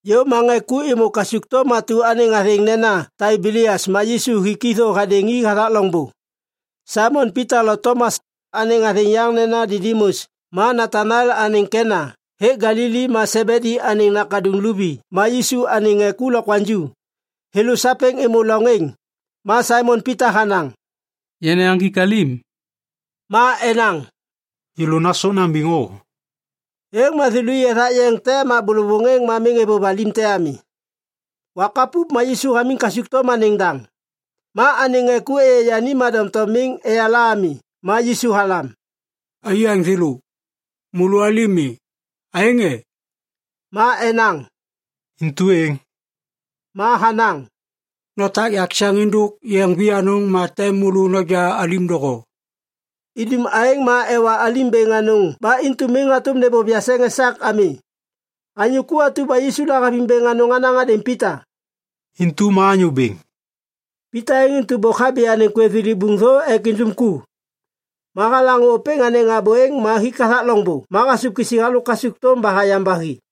Yôv ma ŋê ku êmô kasukthôm atu anêŋ athêŋ nena Taibelias ma Yisu hik i thô hadêŋ i hathak loŋbô. Saimon Pita lo Tomas, anêŋ athêŋ yaŋ nena Didimus, ma Nataniel anêŋ Kena hêk Galili, ma Sebedi anêŋ nakaduŋ luvi, ma Yisu anêŋ ŋê ku lokwaŋju, thêlô sapêŋ êmô loŋ êŋ. Ma Saimon Pita hanaŋ, “Yana yaŋgik alim.” Ma enaŋ, “Yêlô nasôk nambiŋ o.” Êŋ ma thêlô i ethak yeŋ te ma bôlôvôŋ êŋ ma êvôv alim te ami. Wak hapup ma Yisu hamiŋ kasukthôm anêŋ daŋ. Ma anêŋ ŋê ku êyê yani ma doŋtom miŋ eyala ami. Ma Yisu halam, “Aiyaŋ thêlô! Môlô alim mi, aêŋ e?” Ma enaŋ, “Intu êŋ.” Ma hanaŋ, “Notak yakseŋ êndôk yeŋ vianôŋ ma tem môlô noja alim doho.” Idum aêŋ ma ewa alim bêŋ anôŋ ba intu miŋ hatôm nêbôv yakseŋ esak ami. Anyô ku atu ba Yisu lahaviŋ bêŋ anôŋ hanaŋ hadêŋ Pita, “Intu ma Anyô Bêŋ!” Pita êŋ intu bôk habi anêŋ kwêv thilibuŋ thô ek indum ku. Ma halaŋô ôpêŋ anêŋ abô êŋ ma hik hathak loŋbô ma hasôv kisi halôk kasukthôm ba hayam ba hi.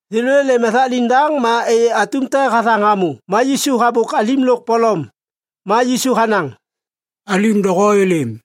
Thêlô êlêm ethak liŋdaŋ ma êyê atum te hathaŋ hamô ma Yisu habôk alim lôk polom. Ma Yisu hanaŋ, “Alim doho êlêm!”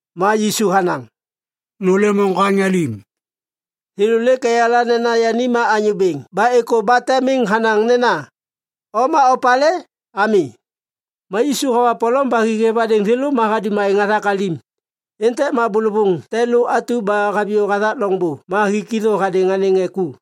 Ma Yisu hanaŋ, “Nôlêm oŋgwaŋ alim!” Thêlô lêk eyala nena yani ma Anyô Bêŋ ba êkô ba te miŋ hanaŋ nena, “O ma opalê?” ami. Ma Yisu hawa polom ba hi hêv hadêŋ thêlô ma hadum aêŋ hathak alim. Êntêk ma bôlôŋ te lô atu ba haviyô hathak loŋbô ba hik i thô hadêŋ anêŋ ŋê ku.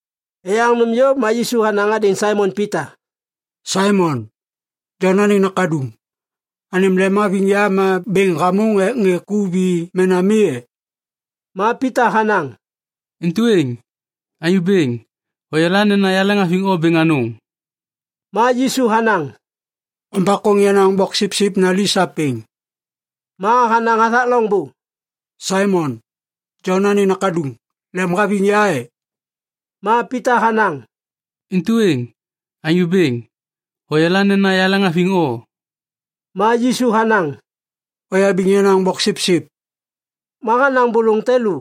Eyaŋ nôm yôv ma Yisu hanaŋ hadêŋ Saimon Pita, “Saimon, Jon anêŋ nakaduŋ, anêm lemhaviŋ ya ma bêŋ hamôŋ ek ŋê ku vi mena mi e?” Ma Pita hanaŋ, “Intu êŋ. Anyô Bêŋ, hoyala nena yaleŋhaviŋ o bêŋ anôŋ.” Ma Yisu hanaŋ, “Ombakôŋ yenaŋ boksipsip nali sapêŋ.” Ma hanaŋ hathak loŋbô, “Saimon, Jon anêŋ nakaduŋ, lemhaviŋ ya e?” Ma Pita hanaŋ, “Intu êŋ. Anyô Bêŋ, hoyala nena yaleŋhaviŋ o.” Ma Yisu hanaŋ, “Oyabiŋ yenaŋ boksipsip.” Ma hanaŋ bôlôŋ te lô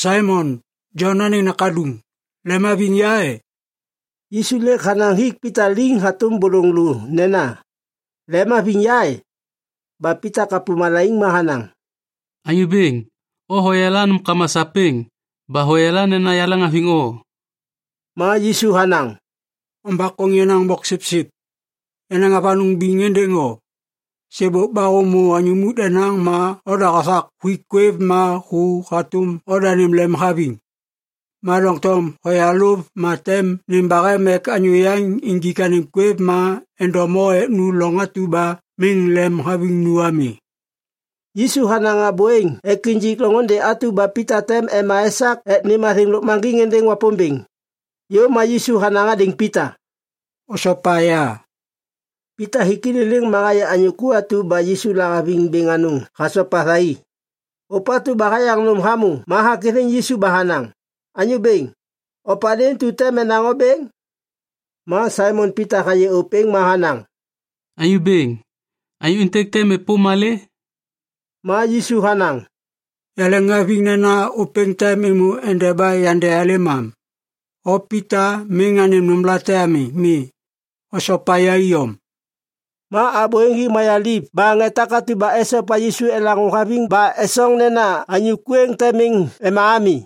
“Saimon, Jon anêŋ nakaduŋ, lemhaviŋ ya e?” Yisu lêk hanaŋ hik Pita liŋ hatôm bôlôŋ lô nena “Lemhaviŋ ya e?” ba Pita kapô malaiŋ ma hanaŋ, “Anyô Bêŋ, o hoyala nômkama sapêŋ ba hoyala nena yaleŋhaviŋ o.” Ma Yisu hanaŋ, “Ombakôŋ yenaŋ boksipsip. Yanaŋ avanôŋ biŋ êndêŋ o. Sêbôk ba hômô anyô muk denaŋ ma oda hothak huik kwêv ma hu hatôm odanêm lemhaviŋ. Ma doŋtom hoyalôv ma tem nêm bahem ek anyô yaŋ injik anêm kwêv ma endom o ek nu loŋ atu ba miŋ lemhaviŋ nu ami.” Yisu hanaŋ abô êŋ ek injik loŋôndê atu ba Pita tem ema esak ek nêm athêŋ lôkmaŋgiŋ êndêŋ Wapômbêŋ. Yôv ma Yisu hanaŋ hadêŋ Pita, “Osopa ya!” Pita hik i liliŋ ma hayê anyô ku atu ba Yisu lahaviŋ bêŋ anôŋ hasopa thai. Ôpatu ba hayaŋ nôm hamô ma hakithiŋ Yisu ba hanaŋ, “Anyô Bêŋ, opalê intu tem enaŋ o bêŋ?” Ma Saimon Pita hayê ôpêŋ ma hanaŋ, “Anyô Bêŋ, anyô êntêk tem êpôm malê?” Ma Yisu hanaŋ, “Yaleŋhaviŋ nena ôpêŋ tem êmô endeba yandealêm am, o Pita miŋ anêm nômlate ami. Mi. Osopa ya iyom.” Ma abô êŋ hi mayaliv ba ŋê takatu ba esopa Yisu elaŋô haviŋ ba esoŋ nena anyô ku êŋ tem miŋ ema ami.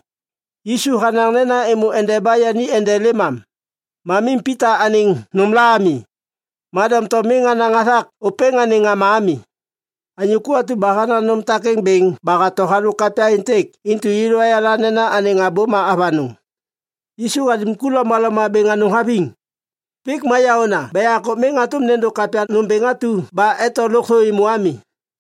Yisu hanaŋ nena êmô endeba yani endelêm am, ma miŋ Pita anêŋ nômla ami. Ma doŋtom miŋ hanaŋ hathak ôpêŋ anêŋ ŋama ami. Anyô ku atu ba hanaŋ nôm takêŋ bêŋ ba hato halôk kapya êntêk intu yêlô ayala nena anêŋ abô ma avanôŋ. Yisu hadum ku lomaloma bêŋ anôŋ haviŋ. Pik ma yaôna ba yakô miŋ hatôm nêndô kapya nômbêŋ atu ba eto lôkthô êmô ami.